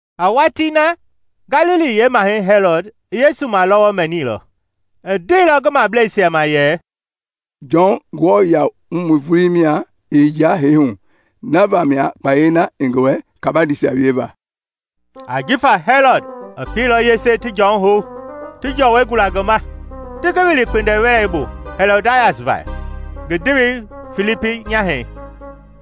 A watii na, Galili yeemahɛi Hɛlɔd i Yesu malɔwɔ mɛnilɔ. I ndeilɔ ngi mableisia ma yɛ, “Jɔn Nguamɔi vulii mia i vulua i hiyea hee hu; na vamia kpayei na i ngi wɛ kabandeisia wieva.” Ajifa Hɛlɔd i pieilɔ yese ti Jɔn hou, ti jɔwɔi gula ngi ma, ti ngi wili kpindiwɛlei bu Hɛlɔdias va, ngi ndewei Filipi nyahɛi.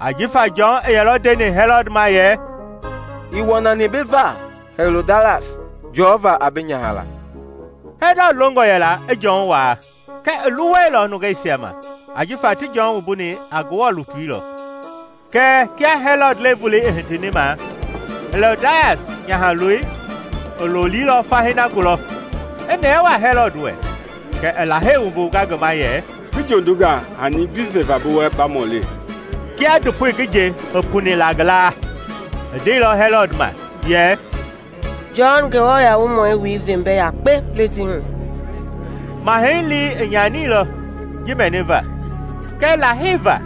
Ajifa Jɔn i yɛlɔ ndeni Hɛlɔd ma yɛ, “Ii wɔnani bi va Hɛlɔdias jɔva a bi nyaha laa.” Hɛlɔd longɔ yɛla i Jɔn waa kɛɛ i luwɛilɔ nungeisia ma ajifa ti Jɔn wumbuni a Ngewɔ lutui lɔ. Kɛɛ kia Hɛlɔd le-volei i hitini ma, Hɛlɔdias nyahaloi i lolilɔ fahii na gulɔ, i nɛɛ waa Hɛlɔd wɛ, kɛ i Lahei wumbunga ngi gama yɛ, “Ngi jondunga hani gbi veva bi wɛ ba mɔli.” Kia ndopoi ngi nje i puni la ngi laa, i ndeilɔ Hɛlɔd ma yɛ, “Jɔn Nguamɔi wui ve mbɛ yakpe pletii hu.” Mahɛi lii i nyanilɔ ji mɛniva kɛɛ Lahei na va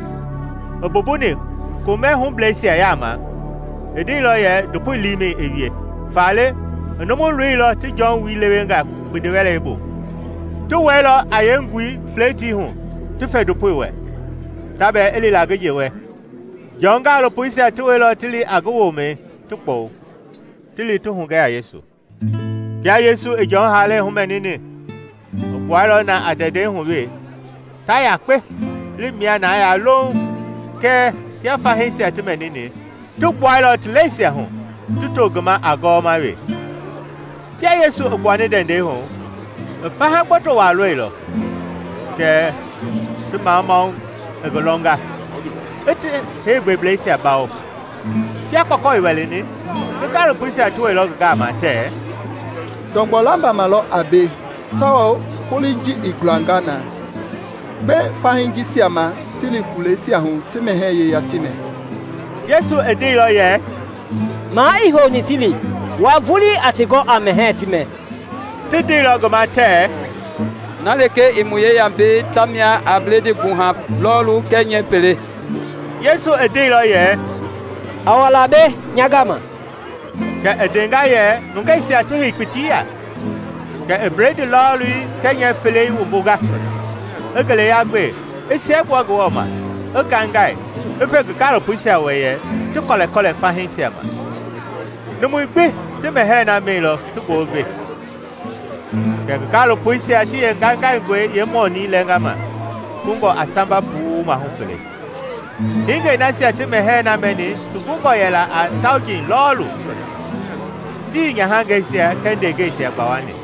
i mbumbuni komɛ hubleisia yaama, i ndeilɔ yɛ ndopoi liimɛi i wie. Faale i numu loilɔ ti Jɔn wui lewe nga kpindiwɛlei bu. Ti wɛilɔ a yeengui pletii hu ti fe ndopoi wɛ, ta bɛɛ i li la ngi nje wɛ. Jɔn gaalopoisia ti wɛilɔ ti li a ngi womɛi, ti kpɔwu, ti li ti hugɛ a Yesu. Kia Yesu i Jɔn haalɛi humɛnini, i gbuailɔ na a ndɛndɛi hu wee, ta yakpe i li mia na yaa louŋ. Kɛɛ kia fahiisia ti mɛnini, ti gbuailɔ ti lɛisia hu ti to ngi ma a gɔwɔma wee. Kia Yesu i gbuani ndɛndɛi hu, i faha lakpa waa lɔilɔ; kɛ ti mamamau i ngi lɔnga, i ti heegbɛblɛisia bawo. Kia kpɔkɔ i wɛlɛni, ngi gaalopoisia ti wɛilɔ ngi gama tɛɛ, “Ndɔgbɔ lambama lɔ a mbei tawao foloi i gulanga na. Gbe fahii jisia ma ti li fuleisia hu ti mɛhɛɛ yeya ti mɛ.” Yesu i ndeilɔ yɛ, “Maa ii houni ti li. Wua vulii a ti gɔ a mɛhɛɛ ti mɛ!” Ti ndeilɔ ngi ma tɛɛ, “Na lekee i mu yeya mbei tamia a bledii gbuha lɔɔlu kɛɛ nyɛɛ fele.” Yesu i ndeilɔ yɛ, “A wa la mbei nya gama.” Kɛ i ndenga yɛ nungeisia ti hei kpiti ya. Kɛ i bledii lɔɔlii kɛɛ nyɛɛ felei wumbunga, i ngeleya gbe, i siɛgbua Ngewɔ ma, i ngaingai, i fe ngi gaalopoisia wɛ, ti kɔlɛkɔlɛ fahiisia ma. Numui gbi ti mɛhɛɛ na mɛilɔ ti goo i ve. Kɛ ngi gaalopoisia ti yeengaingaingɔi yeemɔnii lɛnga ma kungɔ a samba puu maahu fele. Hingei nasia ti mɛhɛɛ na mɛni ti gungɔ yɛla a tauji lɔɔlu, tii nyahangɛisia kɛɛ ndeengɛisia gbawani.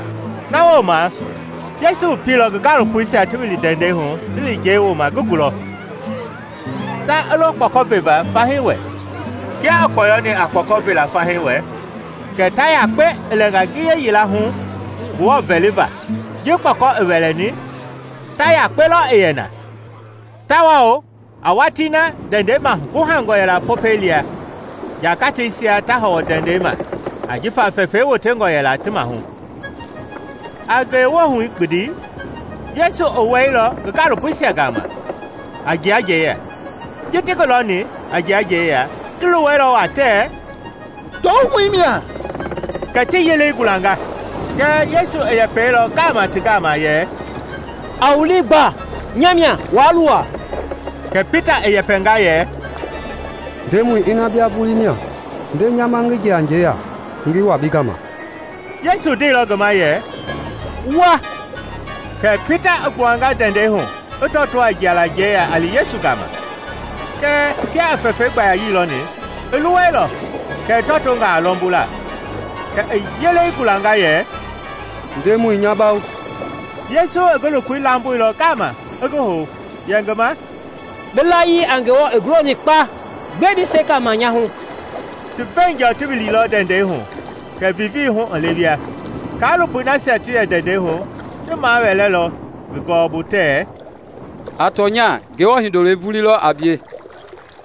Na wooma Yesu i pieilɔ ngi gaalopoisia ti wili ndɛndɛi hu ti li njɛi wooma ngi gulɔ, ta i lo kpɔkɔ veva fahii wɛ. Kia i kpɔyɔni a kpɔkɔ vela fahii wɛ, kɛ ta yakpe i lɛnga ngiye yila hu Ngewɔ vɛliva. Ji kpɔkɔ i wɛlɛni, ta yakpe lɔ i yɛ na; tawao a watii na ndɛndɛi maguhangɔ yɛla Popɛi lia, njagateisia ta hɔwɔ ndɛndɛi ma ajifa fɛfɛi wotengɔ yɛla ti maahu. A ngewohu gbindi, Yesu i wɛilɔ ngi gaalopoisia gama, a jia njɛi ya. Ji ti ngi lɔni a jia njɛi ya, ti luwɛilɔ waa tɛɛ, “Ndɔwumɔi mia!” kɛ ti yelei gulanga. Kɛɛ Yesu i yɛpɛilɔ ngaama ti gama yɛ, “A wu lii gba, nya mia. Waa luwa.” Kɛ Pita i yɛpɛnga yɛ, “Ndemɔi, ina bia vulii mia, nde nya ma ngi jia njɛi ya ngi wa bi gama.” Yesu ndeilɔ ngi ma yɛ, “Wa!” Kɛ Pita i gbuanga ndɛndɛi hu, i tɔto a jialaa njɛi ya a li Yesu gama. Kɛɛ kia i fɛfɛi gbayayii lɔni, i luwɛilɔ, kɛ i tɔtonga a lɔmbula. Kɛ i yelei gulanga yɛ, “Ndemɔi, nya bawo!” Yesu i ngi lokoi lamboilɔ ngaama i ngi hou, yɛ ngi ma, “Bi layii a Ngewɔ i guloni kpa! Gbɛe bi sekani nya hu?” Ti veenjɔ ti wililɔ ndɛndɛi hu kɛ vivii hu i lewea. Kaalopoi nasia ti yɛ ndɛndɛi hu ti mawɛɛlɔ ngi gɔɔbu tɛɛ, “A tɔnya Ngewɔ Hindoloi vulii lɔ a bie!”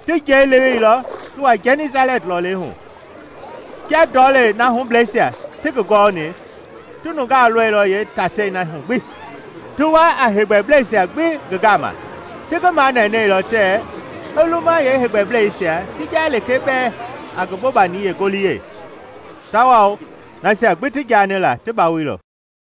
Ti njɛi leweilɔ ti wa Gɛnisalɛt lɔlei hu. Kia yeendɔlɛi na hubleisia ti ngi gɔɔni, ti nunga lɔilɔ yeetatei na hu gbi, ti wa a heegbɛblɛisia gbi ngi gama. Ti ngi manɛnɛilɔ tɛɛ i luma yeeheegbɛblɛisia ti jaa lekee bɛɛ a ngi bobani yeengoliyɛi; tawao nasia gbi ti jaani la, ti bawoilɔ.